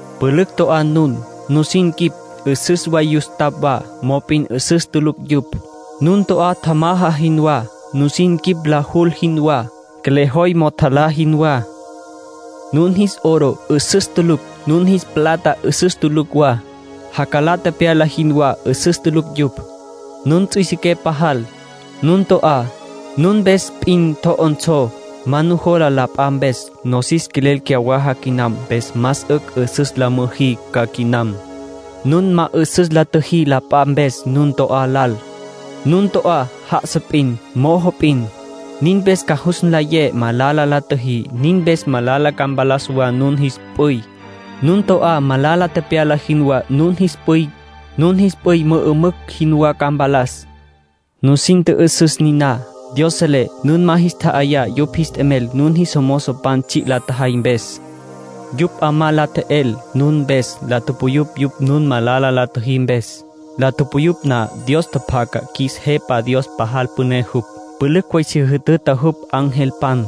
Pülücj to'á nun. Nusin quip 'üsüs way yustapj wa, mop'in 'üsüs tulucj yupj. Nun to'á tjamaja jinwá. Nusin quip la jul jinwá, qjuelejoy mo'o tjalá jinwá. Nun jis oro 'üsüs tulucj; nun jis plata 'üsüs tulucj wa. Jacalá tepyala jinwá 'üsüs tulucj yupj. Nun ts'üisiqué pajal. Nun to'á, nun mpes p'in tjo'onsó. Ma nujola la p'a mpes. Nosis quelel cyawaja quinam, mpes más 'ücj 'üsüs la müjí ca quinam. Nun ma 'üsüs la tjüjí la p'a mpes nun to'á lal. Nun to'á já'asa p'in, mojo p'in. Nin mpes ca jus nlayé malala la tjüjí. Nin mpes malala ca mpalas wa nun jis p'üy, nun to'á malala tepyala jinwá. Nun jis p'üy mü'ümücj jinwá ca mpalas. Nusin tjü'üsüs niná. Dios selé nun ma jis tja'ayá yupj jis t'emel nun jis mozopan tsji' la tjajay mpes. Yupj 'amá la tje'el nun mpes. La tupuyupj yupj nun malala la tjüjí mpes. La tupuyupj na, Dios tjapjaca. Qjuis Jepa Dios pajal püné jupj. Pülücj way si jütüta jupj angelpan.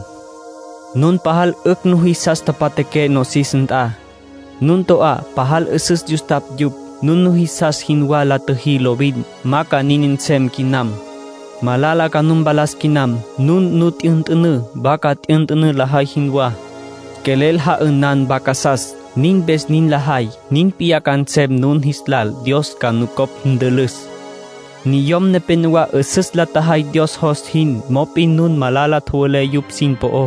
Nun pajal 'ücj nujisas tapatjaqué nosis nt'a. Nun to'á pajal 'üsüs yustapj yupj. Nun nujisas jinwá la tjüjí lovin. Ma ca nin nsem quinam. Malala ca nu mpalas quinam. Nun nu t'yünt'ünǘ, vaca t'yünt'ünǘ lajay jinwá. Quelel ja'ünan vacasas, nin mpes nin lajay. Nin p'iyá ca nsem nun jis lal. (Dios ca nucopj ntülüs.) Niyom nepénowa 'üsüs la tjajay Dios jos jin, mop'in nun malala tjowelé yupj sin po'ó.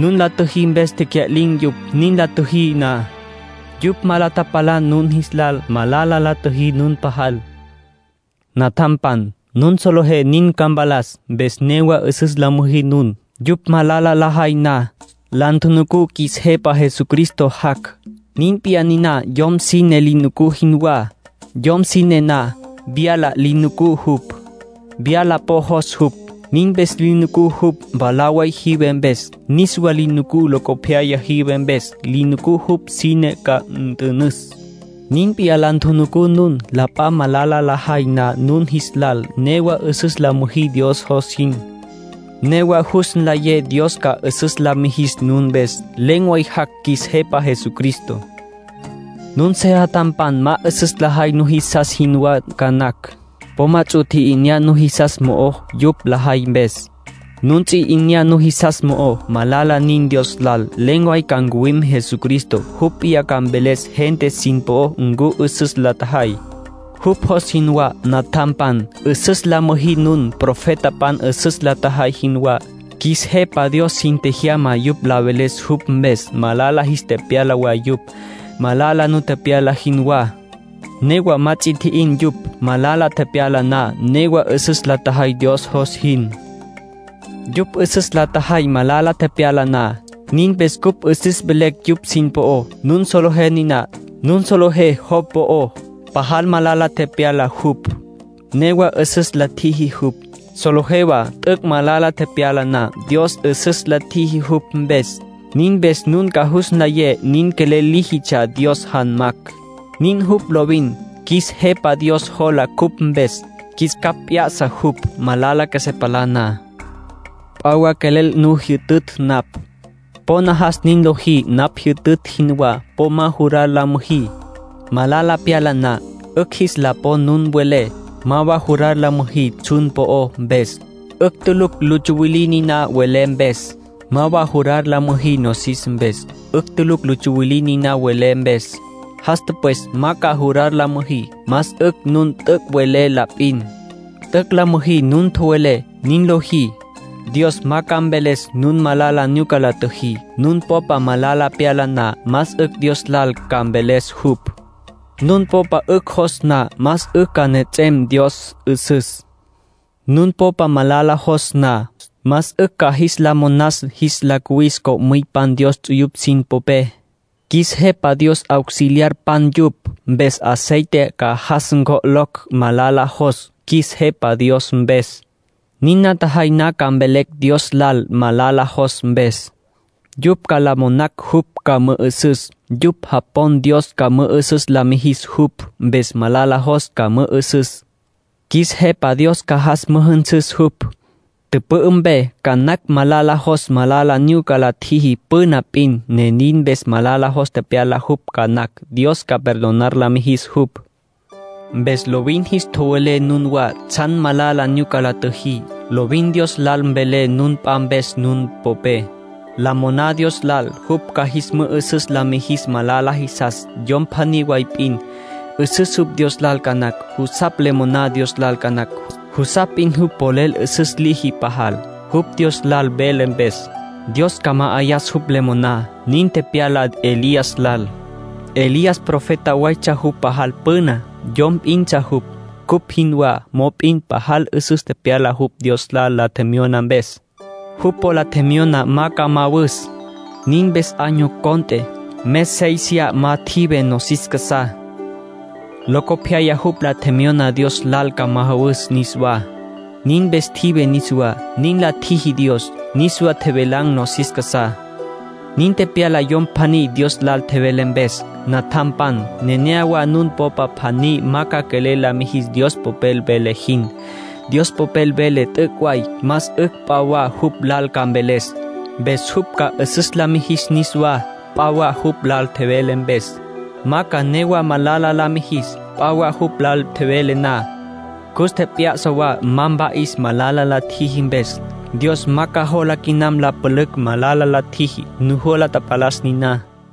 Nun la tjüjí mpes tecya'lin̈ yupj. Nin la tjüjí na, yupj ma la tapalan nun jis lal. Malala la tjüjí nun pajal. Natjampan, nun solejé nin ca mpalas, mpes newa 'üsüs la müjí nun, yupj malala lajay na. La ntjunucú qjuis Jepa Jesucristo jac'. Nin p'iyá niná yom sine li nucú jinwá. Yom sine na, vyala li nucú jupj. Vyala po jos jupj. Nin mpes li nucú jupj mwalá way jive mpes. Niswa li nucú locopyaya jive mpes. Li nucú jupj sine ca nt'ünüs. Nin p'iyá la ntjunucú nun. La p'a malala lajay na nun jis lal, newa 'üsüs la müjí Dios jos jin. Newa jus nlayé Dios ca 'üsüs la mijis nun mpes. Len̈ way jac' qjuis Jepa Jesucristo. Nun sejatjampan ma 'üsüs lajay nujisas jinwá ca nacj. Po ma ts'u tji'inyá nujisas mo'ó yupj lajay mpes. Nun ts'u 'inyá nujisas mo'ó, malala nin Dios lal. Len̈ way ca ncuwim Jesucristo. Jupj p'iyá ca mveles gente sin po'ó ncu 'üsüs la tjajay, jupj jos jinwá. Natjampan, 'üsüs la müjí nun, profetapan 'üsüs la tjajay jinwá. Qjuis Jepa Dios sin tjejyama yupj la veles jupj mpes. Malala jis tepyala wa yupj, malala nu tepyala jinwá. Newa ma ts'a tji'in yupj, malala tepyala na. Newa 'üsüs la tjajay Dios jos jin. Yupj 'üsüs la tjajay malala tepyala na. Nin mpes cupj 'üsüs velecj yupj sin po'ó. Nun solejé niná. Nun solejé Job po'ó. Pajal malala tepyala jupj, newa 'üsüs la tjiji jupj. Solejé wa t'üc' malala tepyala na, Dios 'üsüs la tjiji jupj mpes. Nin mpes nun ca jus nlayé nin quelel líjitsja Dios janmacj. Nin jupj lovin. Qjuis Jepa Dios jola cupj mpes. Qjuis capj p'ya'sa jupj, malala qjuesé palá na. P'a wa quelel nu jyütütj napj. Po najas nin lojí napj jyütütj jinwá. Po ma jurar la müjí, malala pyala na, 'ücj jis la pon nun welé. Ma wa jurar la müjí tsjun po'ó mpes. 'Ücj tulucj lu tsuwilí niná welé mpes. Ma wa jurar la müjí nosis mpes. 'Ücj tulucj lu tsuwilí niná welé mpes. Jas tüpwes ma ca jurar la müjí. Más 'ücj nun t'üc' welé la p'in. T'üc' la müjí nun tjowelé. Nin lojí, Dios ma ca mveles nun malala nyuca la tjüjí. Nun popa malala pyala na, más 'ücj Dios lal ca mveles jupj. Nun popa 'ücj jos na, más 'ücj ca nejets'em Dios 'üsüs. Nun popa malala jos na, más 'ücj ca jis la monas jis la cuwis co'müypan Dios ts'uyupj sin popé. Qjuis Jepa Dios auxiliarpan yupj, mpes aceite ca jas ncjo'locj malala jos, qjuis Jepa Dios mpes. Nin la tjajay na ca mvelecj Dios lal malala jos mpes. Yupj ca la monacj jupj ca mü'ü'süs. Yupj japon Dios ca mü'ü'süs la mijis jupj, mpes malala jos ca mü'ü'süs. Qjuis Jepa Dios ca jas müjünsüs jupj, tüpü'ü mpe. Ca nacj malala jos malala nyuca la tjiji püna p'in, ne nin mpes malala jos tepyala jupj ca nacj. Dios ca perdonar la mijis jupj. Mpes lovin jis tjowelé nunwá tsjan malala nyuca la tjüjí. Lovin Dios lal mvelé nun p'a mpes nun popé. La moná Dios lal jupj ca jis mü'ü'süs la mijis malala jisas. Yom pjaní way p'in, 'üsüs jupj Dios lal ca nacj. Jusapj le moná Dios lal ca nacj. Jusapj p'in jupj polel 'üsüs liji pajal, jupj Dios lal vele mpes. Dios ca ma'ayas jupj le moná. Nin tepyala Elías lal. Elías profeta waytsja jupj pajal püna. Yom p'intsja jupj, cupj jinwá, mop'in pajal 'üsüs tepyala jupj Dios lal la tjemyona mpes. Jupj po la tjemyona ma ca majawus. Nin mpes año cont'e, mes séisiya ma tjive nosis casá. Locopyaya jupj la tjemyona Dios lal ca majawus niswá. Nin mpes tjive niswá, nin la tjiji Dios. Niswa tjevelan̈ nosis casá. Nin tepyala yom pjaní Dios lal tjevele mpes. Natjampan, nenéyawa nun popa pjaní ma ca quelel la mijis Dios Popel vele jin. Dios Popel vele t'üc' way. Más 'ücj p'a wa jupj lal ca mveles, mpes jupj ca 'üsüs la mijis niswá. P'a wa jupj lal tjevele mpes, ma ca newa malala la mijis. P'a wa jupj lal tjevele na, cus tjep'ya'sa wa ma mpa'is malala la tjiji mpes. Dios ma ca jola quinam la pülücj malala la tjiji. Nujola tapalas niná.